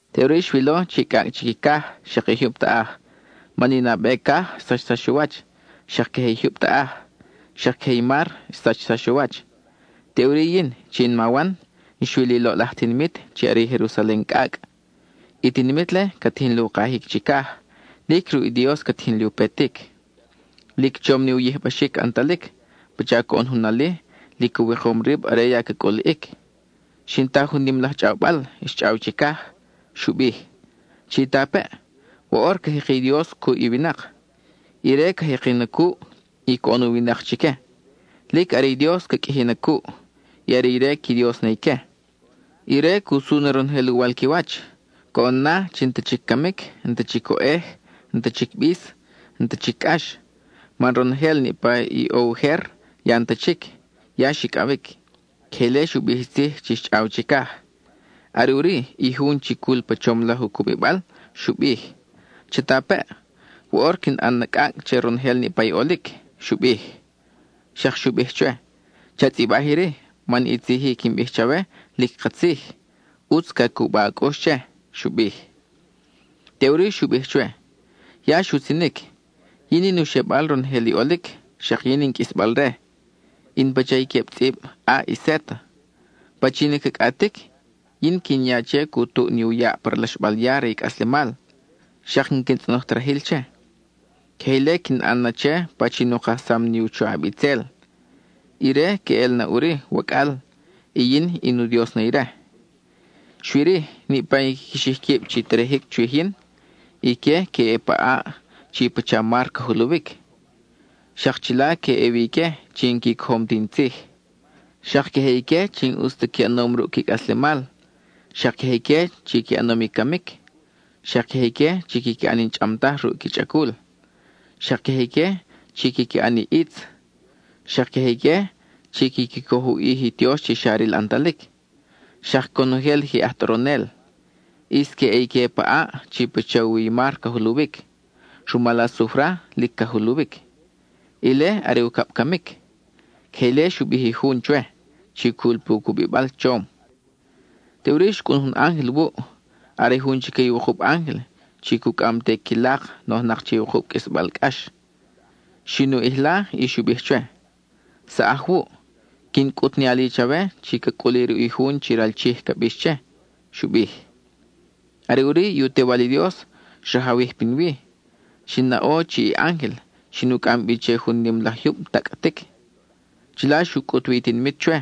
Teʼuri xwilo chi cʼacʼ chic i caj, xak i jyub taʼaj, man i nabe caj xsachsax u wach, xak queje i jyub taʼaj; xak queje i mar xsachsax u wach. Teʼuri yin, chi in ma Wan, xwil i loʼlaj tinimit chi are i Jerusalen cʼacʼ. I tinimit-le ca tijin li u kajic chicaj; lic ruʼ i Dios ca tijin li u petic. Lic chom ni u yijbaxic ʼantalic, pacha coʼon jun ali lic u wikom rib are ya ca cʼuliʼic. Xin ta jun nim laj chʼawbal xchʼaw chicaj; xu bij: —Chitapeʼ, woʼor ca jeki i Dios cuʼ i winak. Ire ca jeki na cuʼ, y coʼon u winak chique. Lic are i Dios ca qʼuiji na cuʼ, y are ire qui Dios na ique. Ire cu su na ronojel uwal qui wach; coʼon na chi n-ta chic camic, n-ta chic oʼej, n-ta chic i bis, n-ta chic i cʼax, man ronojel niʼpa i ʼo ujer ya n-ta chic, ya xicʼawic. (Queje ile xu bij i tzij chi xchʼaw chicaj.) Are ʼuri, i jun chi cul pa chom laj u cubibal xu bij: —Chatapeʼ, woʼor quin ʼan na cʼacʼ che ronojel niʼpa i ʼolic —xu bij. Xak xu bij chwe: —Cha tzʼibaj iri, man i tzij-i quin bij chawe lic katzij, ʼutz ca cuba a cʼux che —xu bij. Teʼuri xu bij chwe: —Ya xutzinic. Yin in u xebal ronojel i ʼolic, xak yin in qʼuisbal-re; in pacha i queb tzʼib A y Z. Pachin i ca cʼatic, yin quin ya che cu tuʼ ni u yaʼ pa ralaxbal ya re i cʼaslemal, xak n-quin tzʼonoj ta rajil che. Queje ile quin ʼan na che pachin u kajsam ni u choʼab itzel; ire queʼel na ʼuri, wacʼal; y yin in u Dios na ire. Xui-ri, niʼpa i quiqui xij quib chi terejic chwij yin, ique que ʼe pa ʼaʼ chi pacha mar ca juluwic. Xak chila que ʼe wi ique chi n-qui cojom ti in tzij; xak queje ique chi n-ʼus ta qui ʼanom ruʼ qui cʼaslemal; xak queje ique chi qui ʼanom i camic; xak queje ique chi quiqui ʼan i n-chʼam taj ruʼ qui chʼacul, xak queje ique chi quiqui ʼan i ʼitz; xak queje ique chi quiqui coj u ʼij i qui tiox chi xa ril ʼantalic; xak conojel i je aj tʼoronel. ʼIs que ʼe ique pa ʼaʼ chi pacha u wi i mar ca juluwic; rumal asufra lic ca juluwic. Ile are ucab camic. (Queje ile xu bij i jun chwe, chi cul pu cubibal chom.) Teʼuri xcʼun jun ángel wuʼ; are jun chique i wukub ángel chi cucʼam te i qui lak, nojnak che i wukub qʼuisbal cʼax. Xin u ʼijla y xu bij chwe: —Saʼaj wuʼ; quin cʼut ni ali chawe chi ca cʼuli ruʼ i jun chi ral Chij ca bix che —xu bij. Are ʼuri i u Tewal i Dios xrajawij pinwi; xin naʼo chi i ángel xin u cʼam bi che jun nim laj jyub tacʼtic. Chila xu cʼut wi i tinimit chwe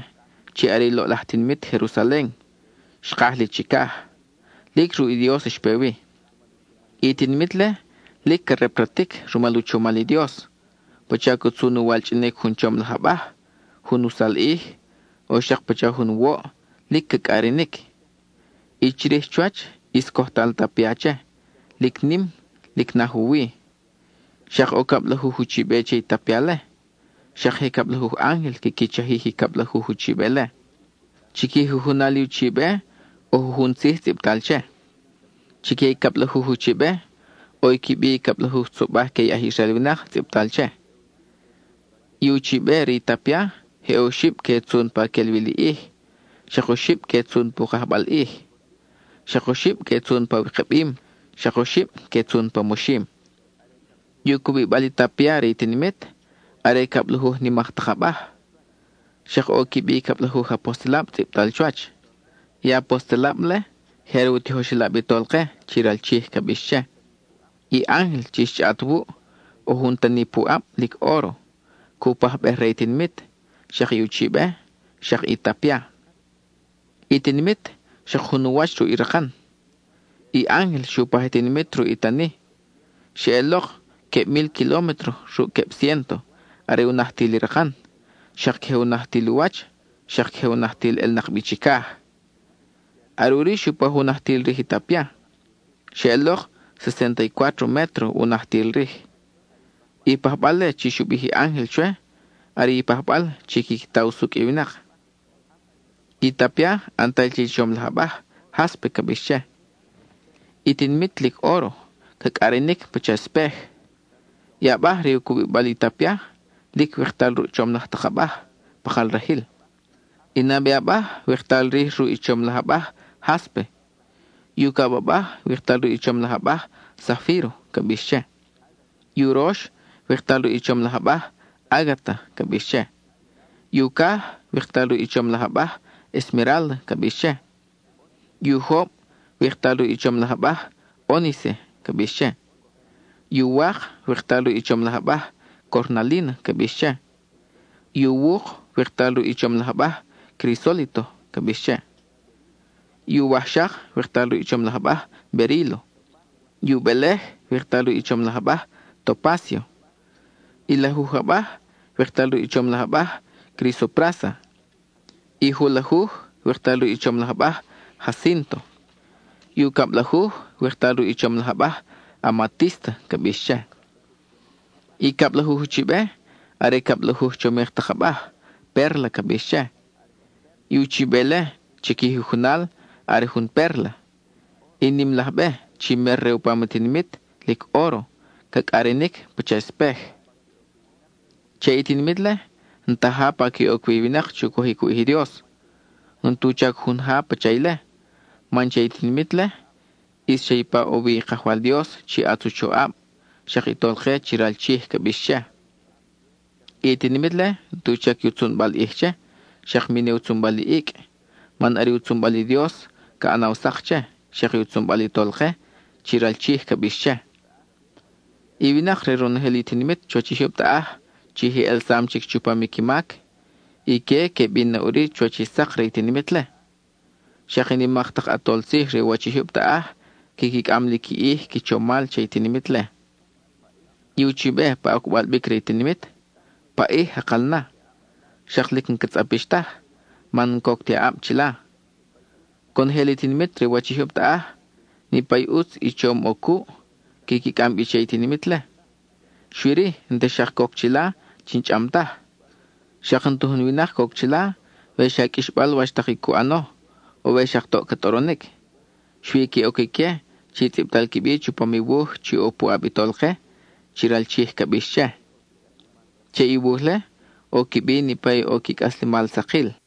chi are i loʼlaj tinimit Jerusalen, xkaj li chicaj; lic ruʼ i Dios xpe wi. I tinimit-le lic ca repratic rumal u chomal i Dios, pacha ca tzun u walchʼinic jun chom laj abaj, jun usalʼij, o xak pacha jun woʼ, lic ca cʼarinic. I chirij chuwach, ʼis cojtal tapia che, lic nim, lic naj u wi. Xak ʼo cablajuj uchibe che i tapia-le, xak je cablajuj ángel quiqui chajij i cablajuj uchibe-le. Chi qui jujunal i uchibe ʼo jujun tzij tzʼibtal che. Chique i cablajuj uchibe, ʼo i qui bi i cablajuj tzobaj que i aj Israel winak tzʼibtal che. I uchibe re i tapia, je oxib que tzun pa quel wi li ʼij; xak oxib que tzun pu kajbal ʼij; xak oxib que tzun pa wikabim; xak oxib que tzun pa moxim. I u cubibal i tapia re i tinimit, are cablajuj nimak tak abaj. Xak ʼo i qui bi i cablajuj apostelab tzʼibtal chuwach. I apostelab-le, je are u tijoxelab i Tolke, chi ral Chij ca bix che. I ángel chi xchʼaʼat wuʼ, ʼo jun tani pu ʼab, lic óro, cu pajbej re i tinimit, xak i uchibe, xak i tapia. I tinimit, xak jun u wach ruʼ i rakan. I ángel xu paj i tinimit ruʼ u tani; xeʼelok queb mil kilómetro ruʼ queb ciénto, are u najtil i rakan, xak queje u najtil u wach, xak queje u najtil ʼelnak bi chicaj. Are ʼuri xu paj u najtil rij i tapia; xeʼelok sesénta y cuátro métro u najtil rij. I pajbal-le chi xu bij i ángel chwe, are i pajbal chi quiqui ta usucʼ i winak. I tapia, ʼantal che i chom laj abaj, jáspe ca bix che. I tinimit, lic óro, ca cʼarinic pacha espej. I abaj re u cubibal i tapia, lic wiktal ruʼ chom laj tak abaj, pakal rajil. I nabe abaj, wiktal rij ruʼ i chom laj abaj, jáspe; i ucab abaj, wiktal ruʼ chom laj abaj, zafíro ca bix che; i urox, wiktal ruʼ i chom laj abaj ágata ca bix che. I ucaj, wiktal ruʼ i chom laj abaj, esmerálda ca bix che. I ujob, wiktal ruʼ i chom laj abaj, ónice ca bix che; i uwak, wiktal ruʼ i chom laj abaj, cornalína ca bix che; i uwuk, wiktal ruʼ i chom laj abaj, crisólito ca bix che; i uwajxak, wiktal ruʼ i chom laj abaj, berílo; i ubelej, wiktal ruʼ i chom laj abaj, topácio; i lajuj abaj, wiktal ruʼ i chom laj abaj, crisoprása; i julajuj, wiktal ruʼ i chom laj abaj, jacínto; i ucablajuj, wiktal ruʼ i chom laj abaj, amatísta ca bix che. I cablajuj uchibe, are cablajuj chomik tak abaj, pérla ca bix che. I uchibe-le, chi qui jujunal, are jun pérla. I nim laj be, chi mer re u pam i tinimit, lic óro, ca cʼarinic pacha espej. Che i tinimit-le, n-ta ja pa que oc wi i winak chu cojic u ʼij i Dios. N-tu chac jun ja pacha ile, man che i tinimit-le, ʼis xa ipa ʼo wi i Kajwal Dios chi ʼatz u choʼab, xak i Tolke chi ral Chij ca bix che. I tinimit-le, n-tu chac i u tzunbal i ʼij che, xak mi ne u tzunbal i icʼ, man are i u tzunbal i Dios ca ʼanaw sak che, xak i u tzunbal i Tolke, chi ral Chij ca bix che. I winak re ronojel i tinimit chuwach i jyub taʼaj (chi je ʼelsam chic chupam i qui mac), ique que bin na ʼuri chuwach i sak re i tinimit-le. Xak i nimak tak ʼatol tzij re u wach i jyub taʼaj quiqui cʼam li qui ʼij qui chomal che i tinimit-le. I uchibe pa ocbal bic re i tinimit, paʼij jakal na; xak lic n-ca tzʼapix taj, man n-coc ti aʼab chila. Conojel i tinimit re u wach i jyub taʼaj, niʼpa i ʼutz i chom ʼo cuʼ, quiqui cʼam bi che i tinimit-le; xui-ri, n-ta xak coc chila chi n-chʼam taj. Xak n-ta jun winak coc chila we xa qʼuixbal wach tak i cu ʼano, o we xak toʼ ca tʼoronic. Xui que ʼoc ique chi tzʼibtal qui bi chupam i wuj chi ʼo pu ʼab i Tolke, chi ral Chij ca bix che. Che i wuj-le ʼo qui bi niʼpa i ʼo qui cʼaslemal sakil.